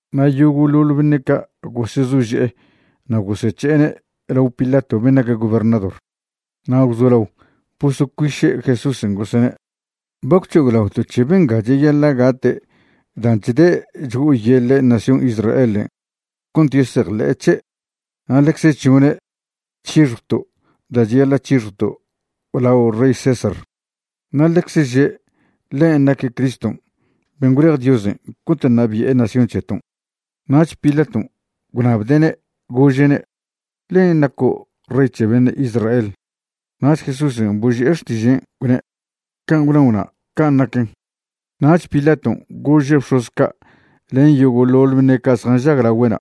Na' yogo'ḻoḻ beṉe' ca' gosezože'e na' gosec̱he'ene' lao Pilaton' ben' nac gobernador. Na' gwzolao bosocuiše' Jesúsen' gosene': ―Ba gwc̱hoglaoto' c̱he benga cheyaḻa' gate' dan' chde' chgo'oyeḻe' nación Israelen' cont yesejḻe'e c̱he' na' ḻecze chžone' c̱hixjwto' da' cheyaḻa' c̱hixjwto' lao rey César. Na' ḻecze že' ḻen' naque' Criston' ben' gwlej Diosen' cont ṉabi'e nación c̱heton'. Nach Pilaton' gwṉabde'ne' gože'ne': ―¿Len' naco' rey c̱he beṉe' Israel? Nach Jesúsen' boži'e xtižen', gwne': ―Can' gwnao'na', can' naquen. Nach Pilaton' gože' bx̱oz ca' len yogo'ḻoḻ beṉe' ca' zjanžag lagüe'na':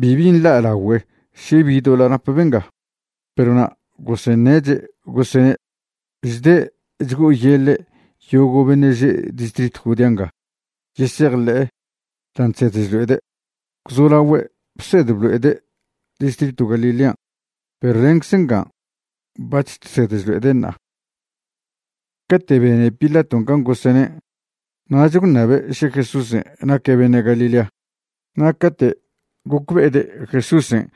―Bibi nḻa'lagüe' še bi doḻa' nap benga. Perw na' goseṉeche', gosene': ―Chde' chgo'oyeḻe' yogo' beṉe' že' distritw Judea nga yesejḻe'e dan' chsed chlo'ede'. Gwzolaogüe' bsed blo'ede' distritw Galilean' perw lencze nga bac̱h chsed chlo'ede' ṉa'a. Cate' bene Pilaton' can gosene', nach gwṉabe' še Jesúsen' naque' beṉe' Galilea. Na' cate' gocbe'ede' Jesúsen'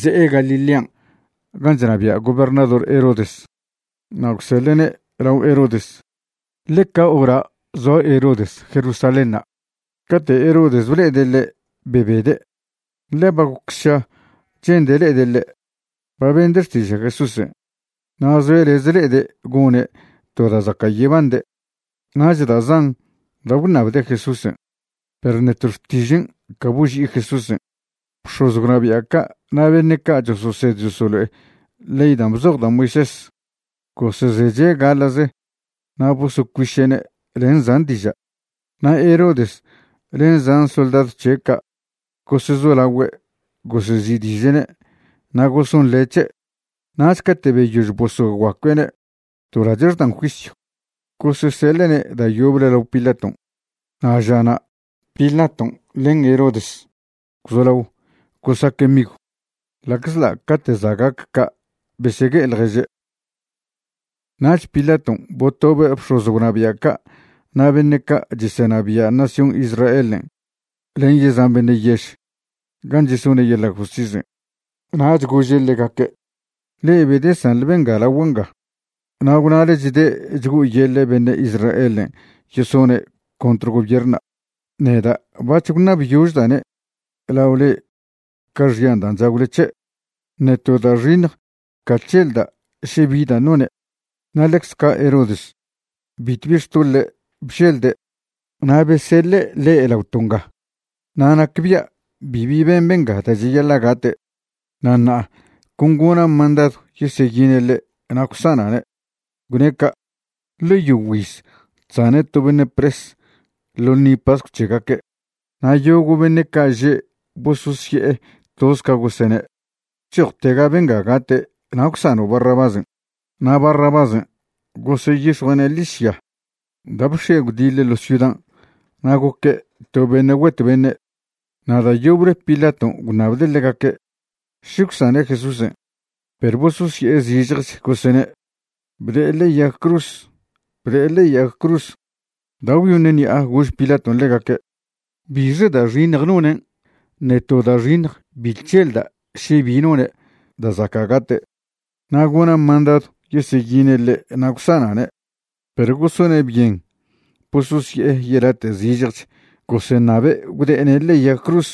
ze'e Galilean' gan' chnabia' gobernador Herodes, na' gwseḻe'ne' lao Herodes, ḻe ca hora' zoa Herodes Jerusalénṉa'. Cate' Herodes ble'ede' ḻe' bebede', ḻe ba goc sša che'nde' le'ede' ḻe'. Ba bende' xtiža' Jesúsen' na' zoe' lez le'ede' gone' to da' zaca' yebande'. Nach da' zan da' gwṉabde' Jesúsen', perw ṉe to xtižen' ca boži'i Jesúsen'. Bx̱oz gwnabia' ca' na' beṉe' ca' chososed chosolo'e ley dan' bzoj da' Moisés gosezeche' gaḻa'ze na' bosocuiše'ne' len zan diža'. Na' Herodes len zan soldadw c̱he' ca' gosezolaogüe' gosezi'diže'ne' na' gosonḻe' c̱he'. Nach cate' beyož bosoguacue'ne' to lache' xdan juisyw, goseseḻe'ne' da' yoble lao Pilaton'. Na' žana' Pilaton' len Herodes gwzolao gosaque' migw, ḻa'czḻa' cate' za' gac ca' besegue'e ḻježe'. Nach Pilaton' botobe' bx̱oz gwnabia' ca' na' beṉe' ca' chesenabia' nación Israelen' len yezan beṉe' yež, gan' chesone' yeḻa' justisen'. Nach gože' ḻegaque': ―Le'e bedesanḻe benga lagua' nga, na' gwnale chde' chgo'oyeḻe' beṉe' Israelen' yesone' contr gobiernṉa'. Neda' bac̱h gwṉabyožda'ne' lao le'e ca xyan' dan' chagwle c̱he', ṉe to da' xiṉj ca chželda' še bi dan' none'. Na' ḻecz ca' Herodes bitw bi xtoḻe' bželde', na' beseḻe' ḻe' laoto' nga. Na' nacbia' bibi ben benga da' cheyaḻa' gate'. Na' ṉa'a con gona' mandadw yeseyine' ḻe' na' gwsana'ne'. Gwne' ca', ḻe yogüiz chsane' to beṉe' pres ḻo ḻṉi pascw c̱hegaque'. Na' yogo' beṉe' ca' že' bososye'e toz ca gosene': ―Chojtega benga gate' na' gwsano' Barrabásen'. Na' Barrabásen' goseyix̱jue'ne' ḻižya da' bx̱ie' gwdiḻe ḻo' ciudan' na' goque' to beṉe' güet beṉe'. Na' da' yoble Pilaton' gwṉabde' ḻegaque' še gwsane' Jesúsen', perw bososye'e zižjech gosene': ―¡Bde'e ḻe'e yag cruz! ¡Bde'e ḻe'e yag cruz! Da' gwyoṉ ṉi'a gož Pilaton' ḻegaque': ―¿Bixe da' xiṉj nonen'? Ṉe to da' xiṉj bi chželda' še bi none' da' zaca' gate'. Na' gona' mandadw yeseyine' ḻe' na' gwsana'ne'. Perw gosone' byen bososye'e yelate' zižjech goseṉabe' gwde'ene' ḻe'e yag cruz.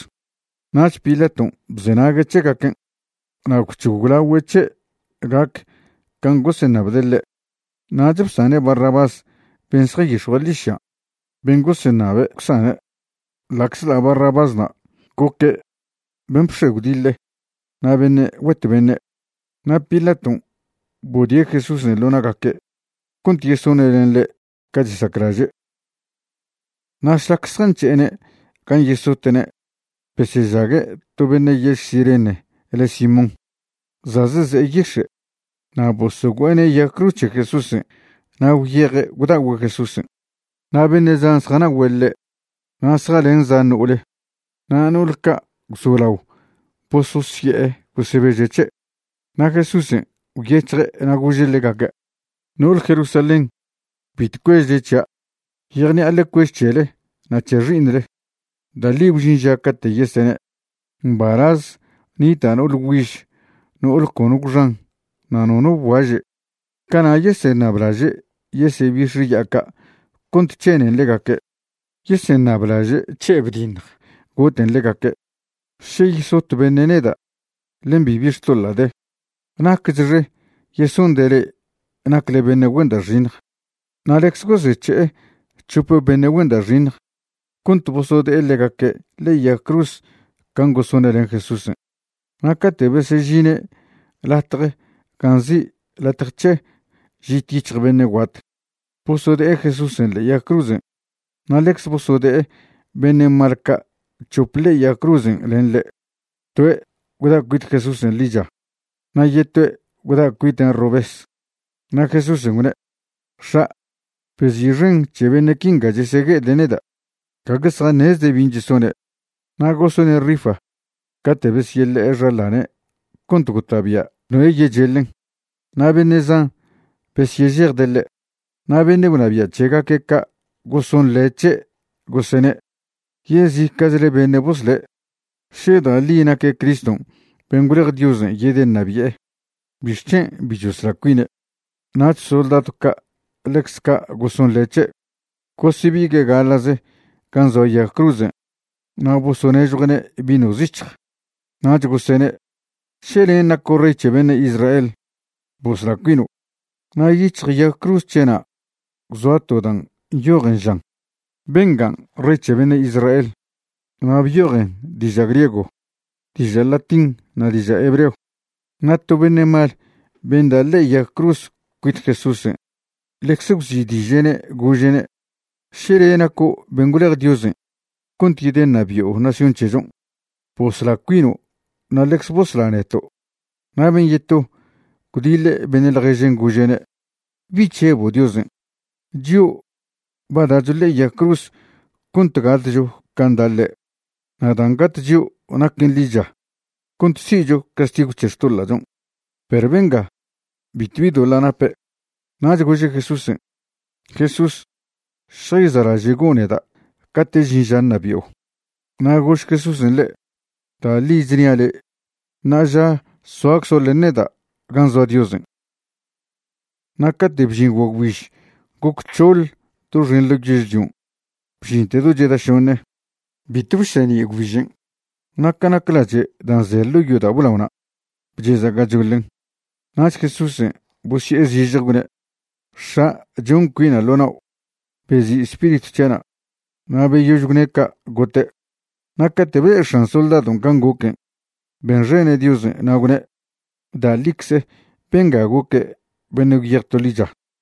Nach Pilaton' bzenague' c̱hegaquen' na' gwc̱hoglagüe' c̱he' gac can' goseṉabde' ḻe'. Nach bsane' Barrabás ben' zjanyix̱jue' ḻižyan', ben' goseṉabe' gwsane', ḻa'czḻa' Barrabásna' goque' ben' bx̱ie' gwdiḻe na' beṉe' güet beṉe'. Na' Pilaton' bodie' Jesúsen' ḻo na'gaque' cont yesone' len ḻe' ca chesaclaže'. Na' šlac zjanc̱he'ene' gan' yesote'ne' besyežague' to beṉe' yež Cirene le' Simón, za' zeze'e yix̱e'. Na' bosogüe'ene' yag cruz c̱he Jesúsen' na' gwyeje' gwda'ogüe' Jesúsen'. Na' beṉe' zan zjana'ogüe' ḻe' na' zjalen zan no'ole. Na' no'ol ca' gwzolao bososye'e gosebeže' c̱he'. Na' Jesúsen' gwyec̱hje' na' gože' ḻegaque': ―No'ole Jerusalén, bitw cuežle c̱hia'. Yejṉi'a ḻe cuež c̱hele na' c̱he xi'iṉle. Da' ḻi gwžin ža cate' yesene': “Mbalaz nita' no'ole güiž no'ole cono gwxan na' nono bguaže'.” Cana' yeseṉablaže' yesebix̱e ya'a ca' cont c̱henen ḻegaque'. Yeseṉablaže' c̱he' bdiṉj goten ḻegaque'. Še yesot beṉe' neda' len bibi xtoḻa' de, ¡nacchxe yesonde' le'e nacle beṉe' güen da' xiṉj! Na' ḻecze gosec̱he'e c̱hop beṉe' güen da' xiṉj cont bosode'e ḻegaque' ḻe'e yag cruz can' gosone' len Jesúsen'. Na' cate' besežine' latje gan' nzi' Latje c̱he Žit Yic̱hj Beṉe' Guat, bosode'e Jesúsen' ḻe'e yag cruzen'. Na' ḻecze bosode'e beṉe' mal ca' c̱hop ḻe'e yag cruzen' len ḻe', toe' gwda' cuit Jesúsen' ḻicha, na' yetoe' gwda' cuiten' robes. Na' Jesúsen' gwne': ―X̱a', bezi'xen c̱he beṉe' quinga chesegue'ede' neda'. Gague zjaṉezde' bin' chesone'. Na' gosone' rifa cate' besyeḻe'e xaḻane' cont gota'bia' noe' yecheḻen. Na' beṉe' zan besyežejde' ḻe'. Na' beṉe' gwnabia' c̱hegaque' ca' gosonḻe' c̱he', gosene': ―Yezica'chle beṉe' bosle'. Še da' ḻi naque' Criston' ben' gwlej Diosen' yedeṉabi'e, ¿bixc̱hen' bi chosla cuine'? Nach soldadw ca' ḻecz ca' gosonḻe' c̱he'. Gosebigue' gaḻa'ze gan' zoa yag cruzen' na' bosonežjue'ne' vino zic̱hj. Nach gosene': ―Še len' naco' rey c̱he beṉe' Israel, bosla cuino'. Na' yic̱hj yag cruz c̱he'na' gwzoa to dan' nyojen, žan: “Bengan' rey c̱he beṉe' Israel.” Na' byojen diža' griego, diža' latín na' diža' hebreo. Na' to beṉe' mal ben' da' ḻe'e yag cruz cuit Jesúsen' ḻecze gwzi'diže'ne', gože'ne': ―Še le' naco' ben' gwlej Diosen' cont yedeṉabi'o nación c̱hechon', bosla cuino' na' ḻecze bosla neto'. Na' ben' yeto gwdiḻe' beṉe' ḻježen' gože'ne': ―¿Bi chžebo' Diosen'? Chio' ba da'cho ḻe'e yag cruz cont gatcho can' da' ḻe', na' dan' gat chio' naquen ḻicha cont si'cho castigw c̱he xtoḻa'chon'. Perw benga, bitw bi doḻa' nape'. Nach gože' Jesúsen': ―Jesús, šjayza'laže'go' neda' cate' žin ža ṉabi'o. Na' gož Jesúsen' ḻe': ―Da' ḻi chnia' le', ṉa'aža soaczo' len neda' gan' zoa Diosen'. Na' cate' bžin guagwbiž goc c̱hoḻ doxen ḻo yežlion' bžinte do cheda šoṉe. Bitw bseṉi' gwbižen'. Na' ca nac lache' dan' ze ḻo' yodao' blaona', bcheza' gachoḻen. Nach Jesúsen' bosye'e zižje gwne': ―X̱a', chon cuina' ḻo nao', bezi' spiritw c̱hia'na'. Na' beyož gwne' ca' gote'. Na' cate' ble'e x̱an soldadon' can' goquen', benxene' Diosen' na' gwne': ―Da' ḻicze benga goque' beṉe' gwyej to ḻicha.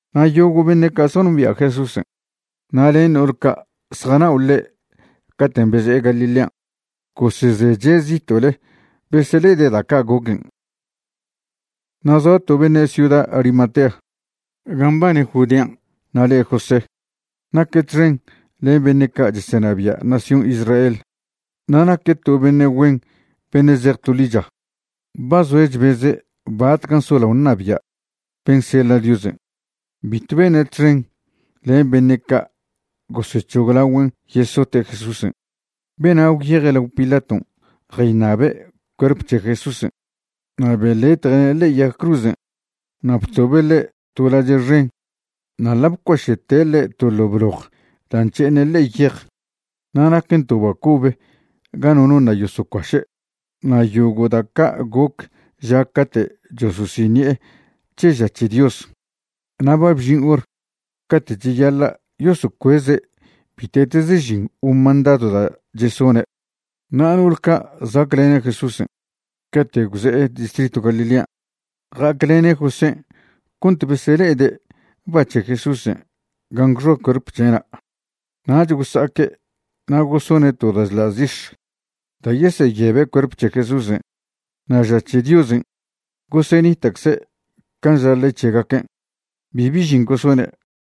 Na' yogo' beṉe' ca' zjanombia' Jesúsen', na' len no'ol ca' zjanao' ḻe' caten' beze'e Galilean', gosezeche' zito'le besele'ede' da' ca' goquen'. Na' zoa to beṉe' ciuda Arimatea gan' mbane Judean' na' le' José. Naque' txen len beṉe' ca' chesenabia' nación Israel, na' naque' to beṉe' güen beṉe' zej to ḻicha. Ba zoe' chbeze' batcan' solao ṉabia' ben' seḻa' Diosen'. Bitw bene' txen len beṉe' ca' gosec̱hoglagüen' yesote' Jesúsen'. Bena' gwyeje' lao Pilaton' jayṉabe' cuerp c̱he Jesúsen'. Na' beḻetje'ne' ḻe'e yag cruzen' na' btobe' ḻe' to lache' xen na' ḻa' bcuaše'te' ḻe' to ḻo' bloj da' nc̱he'eṉe' ḻe'e yej. Na' naquen to ba cobe ga nono ṉa' yosocuaše'. Na' yogo' da' ca' goc ža cate' chososiṉi'e c̱he ža c̱he Dios. Na' ba bžin hor cate' cheyaḻa' yosocueze' bite'teze žin o mandadw da' chesone'. Na' no'ol ca' za'aclene' Jesúsen' cate' gwze'e distritw Galilean' ja'aclene' Josén' cont besele'ede' ba c̱he Jesúsen' gan' gwxoa cuerp c̱he'na'. Nach gosa'aque' na' gosone' to da' chḻa' zix̱ da' yeseyebe' cuerp c̱he Jesúsen'. Na' ža c̱he Diosen' gosenita'cze can' ža ley c̱hegaquen', bibi žin gosone'.